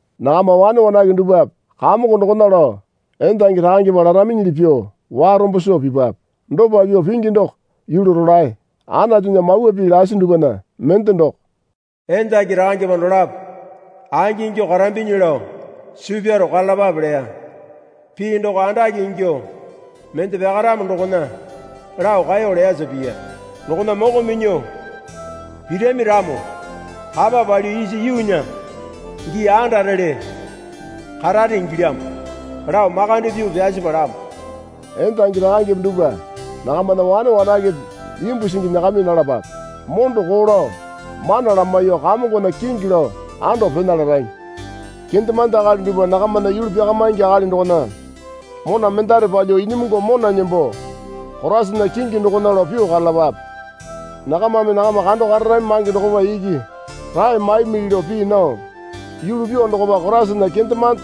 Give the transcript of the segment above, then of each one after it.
Nakama wane wanake dupwape Kamongo dokona lao endangi rakangepa laraminyili pyuo warombo soo pipape. Dopa pyuo pingi doko yulu rolae. Anatunya mawa pii lasi dupwana mende doko, Endangi rakangepa dolapo angingyuo karambinyi lao suu pyaro karalapape leya. Pii doko andake ingyuo mende pyakaramo dokona lao kaeyo leyasa piya. Dokona moko minyuo pirami ramo kapa palyuo isa yuunya gii andarele karare ingilyamo lao makande pyuo pyasi palamo. Endangi rakangepe dupwa nakamana wane wanakepe imbu singi nyakami nalapape. Mondo koo lao mana lamaiyuo Kamongona kingi lao ando pena larami. Kendemande akali dupwa nakamana yulu pyakamaingi akali dokona mona mendare palyuo inyimungu mona nembo Koraisana kingi dokona lao pyuo karalapape. Nakamame nakama kando kararami mange dokopa iki rae maimili lao pii nao, yulu pyuo dokopa Koraisana kendemande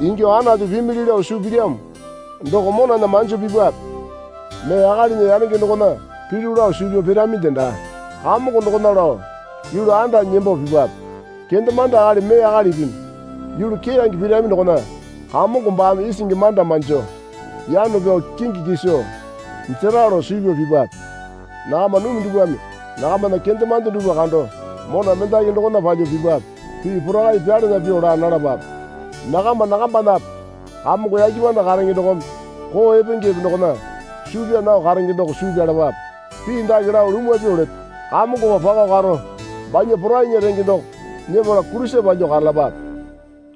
ingyuo Anatu pimili lao suu pilyamo doko monana manjo pipwape. Mee akalinya yanenge dokona pilyu lao suu pyao piraminde daa. Kamongo dokona lao yulu andanyi nembo pipape. Kendemande akali mee akalimipi yulu keyange pirami dokona Kamongo baame isingi manda manjo yano pyao kingi kiso jera lao suu pyao pipape. Nakama numi dupwame, nakamana kendemande dupwa kando mona mendaki dokona palyuo pipape. Pii porakai pyalana pyuo laa nalapape. Nakama nakambanape Kamongo yake panda karenge dokome koo epengepe dokona suu pyaa nao karenge doko suu pyalapape. Pii dake lao lumwa pyuo leto. Kamongopa pako karo banya porainya renge doko nyepala kulisa palyuo karalapape.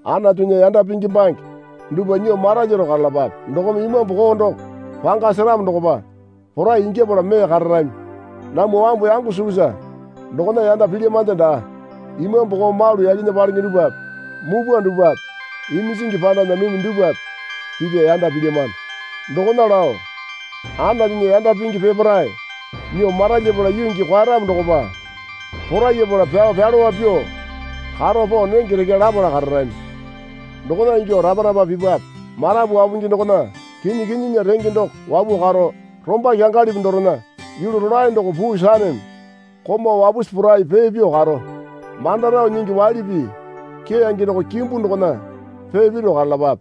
Anatunya yanda pingi bange dupwa nyuo maralyaro karalapape. Dokome imambu koo doko panga seramo dokopa porai ingyapala mee kararami. Namwa wambu yango sukusa dokona yanda pilyamande daa. Imambu koo malu yakena palenge dupwape mupwa dupwape iminjingi pandana numi dupwape pipya yanda pilyamano. Dokona lao Anatunya yanda pingi peparae nyuo maralyapala yuu gii kwaeyaramo dokopa porayapala pyao pyalowa pyuo karo pao nenge rekya lapala kararami. Dokona ingyuo rapa rapa pipape. Marapu wapungi dokona kinyi kinyinya renge doko wapuo karo, romba kyangalipi dorena yulu rolae doko puu saneme komau wapusi porai pee pyuo karo. Manda rao nyingi waili pii keyange doko kimbu dokona pee piro karalapape.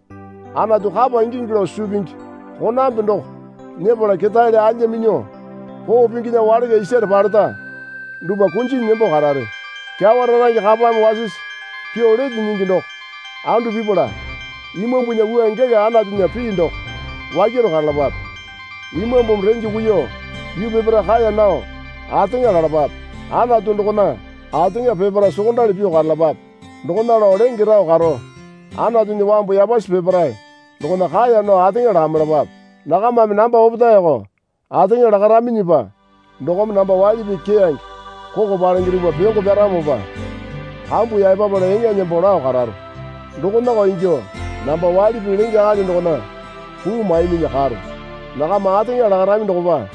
Anatu kapa ingingi lao suu pingi konambe doko nyepala ketaele alya minyuo koo pinginya walaka isare paleta dupwa kunjinyi nembo karare. Kyawa rarange kapame wasisi pyuo lete nyingi doko andu pipala, Imambunya wua gela Anatunya pii doko wakyaro karalapape. Imambumi renge kuiyuo yuu peparae kaeya nao ateŋa lalapape. Anatu dokona ateŋa peparae sokondali pyuo karalapape. Dokona lao lenge rao karo, Anatunya wambu yapasi peparae dokona kaeya nao ateŋa lakamailapape. Nakamame namba opetaeko ateŋa lakaraminyipa dokome namba waili pii keyange koko palenge dupwa pyongo pyaramopa kambu yaepapala eŋa nembo lao kararo. Dokonako ingyuo namba waili pii lenge akali dokona puu maiminyi karo. Nakama ateŋa lakarami dokopa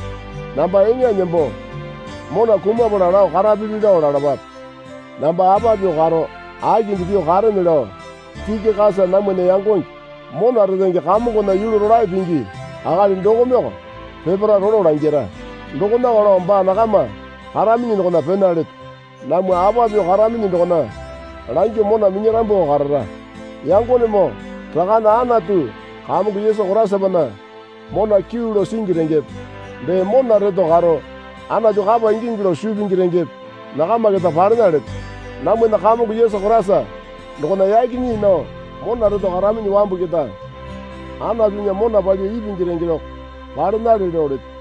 namba eŋa nembo mona kumapala lao karapili lao lalapape. Namba apa pyuo karo akinde pyuo karene lao Tikikasa namwana yangonge mona retenge Kamongona yulu rolae pingi akali dokomeoko peparae rolo langira. Dokonako lao baa nakama karaminyi dokona pena leto. Namwa apa pyuo karaminyi dokona langyuo mona minyarambwako karara. Yangonemoo Rakane Anatu Kamongo Yesu Koraisapana mona kyuu lao singi rengepe dee mona reto karo Anatu kapa ingingi lao suu pingi rengepe nakama keta palena leto. Namwana Kamongo Yesu Koraisa dokona yaki nyii nao mona reto karaminyi wambu keta Anatunya mona palyuo ipingi renge doko palenale lao leto.